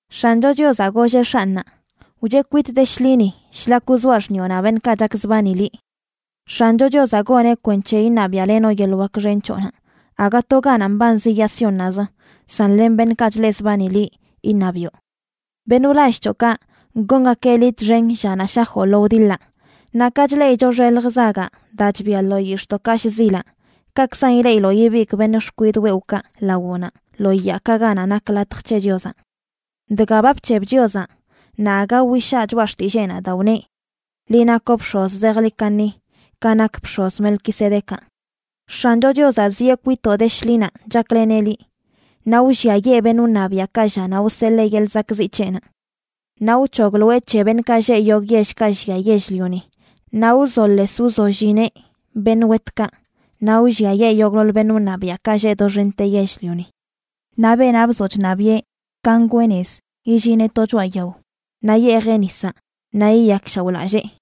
X̱ancho Chiozaꞌ golleꞌ X̱anꞌnaꞌ: “Wcheꞌ kwitꞌ de shḻini,a shlak wzoaꞌ xṉiꞌonaꞌ beṉꞌkaꞌ chakzbani liꞌ.” X̱ancho Chiozaꞌ goneꞌ kwenc̱he iṉabiaꞌlenoꞌ yeḻꞌ wak xen c̱hoꞌnaꞌ, aga to ganaꞌ mbanzi yaa Siónnaꞌzə, san len beṉꞌkaꞌ chleꞌzbani liꞌ iṉabiꞌo. Beṉꞌ wlall c̱hoꞌkaꞌ, gongakeꞌ liꞌ txen llanaꞌ shajoꞌ lo wdiḻaꞌ. Naꞌ ka chleꞌicho xelj zagaꞌ daa chbia lo yix̱ꞌdoꞌkaꞌ shzilaꞌ, kaꞌkzan ileꞌiloꞌ ibigꞌ beṉꞌ xkwidꞌ wewꞌkaꞌ lawoꞌnaꞌ lo yaakaꞌ ganaꞌ nak latj c̱he Chiozaꞌ. Dga ba bc̱heb Chiozaꞌ naꞌ aga wishaa choꞌa xtilleenaꞌ daa wneꞌ: “Liꞌ nakoꞌ bx̱oz zejḻi kaṉi, ka nak bx̱oz Melquisedecaꞌ.” X̱ancho Chiozaꞌ zieꞌ kwitoꞌ de shḻinaꞌ chakleneꞌ liꞌ, naꞌ wlliayee beṉꞌ wṉabiaꞌkaꞌ llanaꞌ wseḻee yeḻꞌ zakꞌziꞌ c̱heꞌnaꞌ. Naꞌ wc̱hogloeꞌ c̱he beṉꞌkaꞌ lleꞌ yogꞌ yellkaꞌ llia yell-lioni naꞌ wzoles wzollineꞌ beṉꞌ wetkaꞌ, naꞌ wlliayee yogꞌḻoḻ beṉꞌ wṉabiaꞌkaꞌ lleꞌ doxente yell-lioni. Naꞌ beenaꞌ bzoꞌ chṉabiꞌe ka ngwee nez, illineꞌ to choꞌa yao, naꞌ yeejeꞌ nisaꞌ naꞌ yiyakshaoꞌlallee.